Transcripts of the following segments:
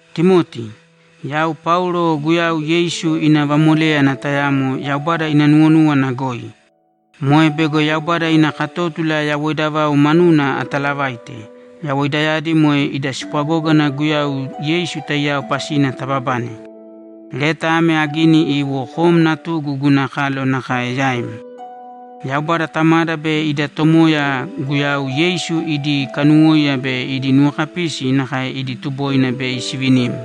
Timoti, Yau Paulo Guyau Yeisu ina vamoléyana tayamo Yaubada ina nuwonúwana goi. Moe bego Yaubada ina katótula yawoida vau manuna atalavaite, yawoidayadi moe ida spwagógana Guyau Yeisu taiyao pasina tababane. Leta ame agini iwo kom natugu guna kalo nakae yaim. Yaubada Tamada be ida Tomoya Guyau Yeisu idi kanuwóiya be idi nuwokapisi nakae idi tuboina bei sivinim.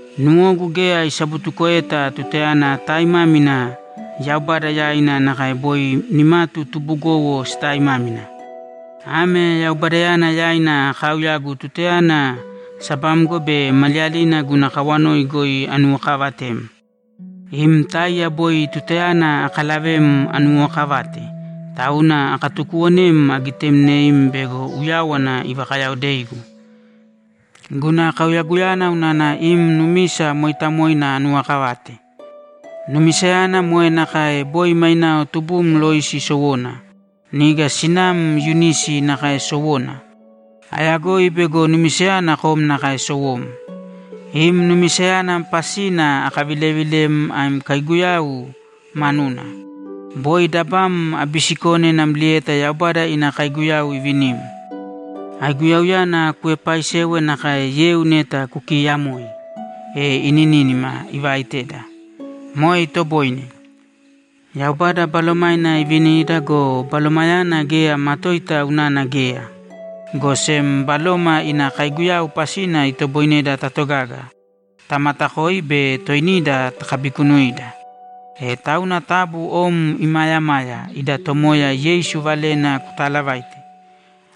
Nuwogu geya isabutukoeta tutayana ataaimámina Yaubada yaina nakae boi nimatu tubugowo sitaaimámina. Ame Yaubadayana yaina akaauyagu tutayana sabamgo be maliyalina guna kawanoi goi anuwokaavatem. Im táiya boi tutayana akalavem anuwookavate, tauna akatukuuwonem agitemneim bego uyáwana ivakayaodeigu. Guna kauyaguyana unana im numisa mooitamoina anuwokavate. Numisayana moe nakae boi mainao tubum Loisi sowona, niga sinam Yunisi nakae sowona. Ayagoi bego numisayana kom nakae sowom. Im numisayana pasina akavilevilem am kaiguyau manuna. Boi dabam abisikone namlieta Yaubada ina kaiguyau ivinim. Aiguyauyana kuepaaisēwe nakae yeu neta kukiyamoi, e inínima ivaiteda. Moe itoboine. Yaubada Balomaina ivinida go, Balomayana geya matoita unana geya, go sem Baloma ina kaiguyau pasina itoboineda tatogaga, tamatakoi be toinida takabikunuida. E tauna taabu om imaayamāya ida Tomoya Yeisu valena kutaalavaite.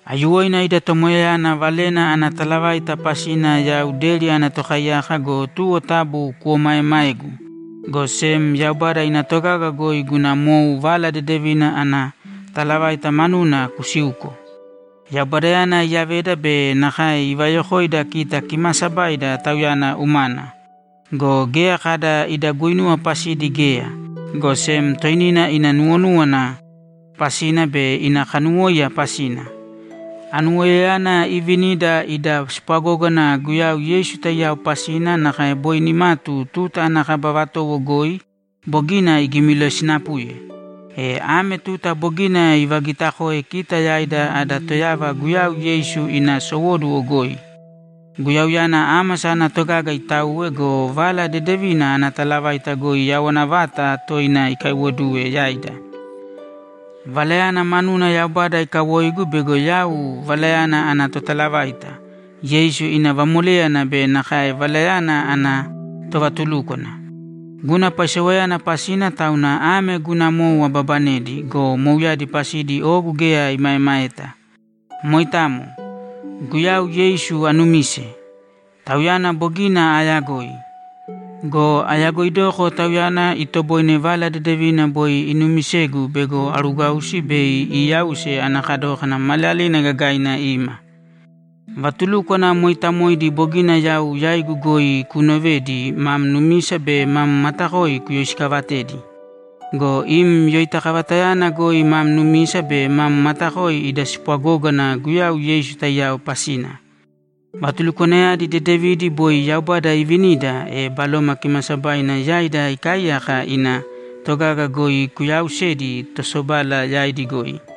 Aiyuwoina ida Tomoyayana valena ana talavaita pasina yau deri ana tokaiyaka go, tuwo taabu kuomaeemāegu, go sem Yaubada ina togaga goi guna mou Vala Dedevina ana talavaita manuna kusīuko. Yaubadayana iyaveda be nakae ivayokoida kita kimaasabaida Tauyana umana. Go geya kada ida guinuwa pasidi geya, go sem toinina ina nuwonúwana pasina be ina kanuwóiya pasina. Anuwoiyayana ivinida ida spwagógana Guyau Yeisu taiyao pasina nakae boi nimatu tuta ana kaba vatowo goi bogina igimilosinapuye. E ame tuta bogina ivagitakoe kita yaida ada Toyava Guyau Yeisu ina sowóduwo goi. Guyauyana ámasa ana togaga itauwe go, Vala Dedevina ana talavaita goi yawana vata toina ikaiwoduwe yaida. Valayana manuna Yaubada ikawoigu bego yau valayana ana totalavaita, Yeisu ina vamoléyana be nakae valayana ana tovatulúkwana. Guna paisewayana pasina tauna ame guna mou ababanedi go, mouyadi pasidi ogu geya imaemaeta. Moitamo. Guyau Yeisu aanumise; Tauyana bogina aayagoi. Go ayagoidoko Tauyana itoboine Vala Dedevina boi inuumisegu bego aruugwausi bei iiyause ana kadókana maliyalina gagaina ima. Vatulúkwana mooitamoidi bogina yau yaigu goi kuunovedi mam numisa be mam matakoi kuyoisikaavatēdi. Go imi yoitakavatayana goi mam numisa be mam matakoi ida spwagógana Guyau Yeisu taiyao pasina. Vatulukwanayadi dedevidi boi Yaubada iivinida, e Baloma Kimaasabaina yaida ikaaiyaka ina togaga goi kuyaausēdi tosobala yaidi goi.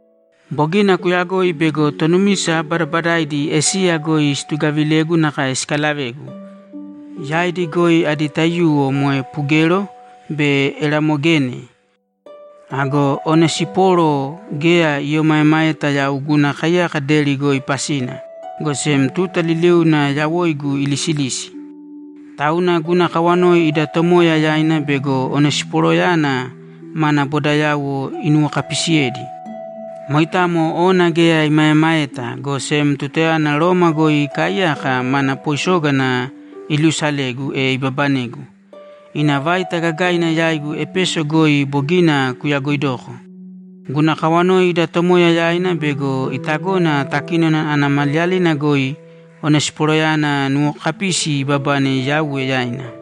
Bogina kuyagoi bego tonumisa badabadaidi Esiya goi situgavilegu nakae sikalavegu. Yaidi goi adi taiyuwo moe Pugelo be Eramogene. Ago Onesiporo geya iomaemaeta yau guna kaiyaka deri goi pasina, go sem tuta liliuna yawoigu ilisilisi. Tauna guna kawanoi ida Tomoya yaina bego Onesiporoyana mana bodayauwo inuwokapisiyedi. Moitamo ona geya imaemaeta, go sem tutayana Roma goi ikaaiyaka, mana poisógana iluusalegu, e ibabanegu. Ina vaita gagaina yaigu Epeso goi bogina kuyagoidoko. Guna kawanoi ida Tomoya yaina bego itagona takínona ana maliyalina goi Onesiporoyana nuwokapisi ibabane Yauwe yaina.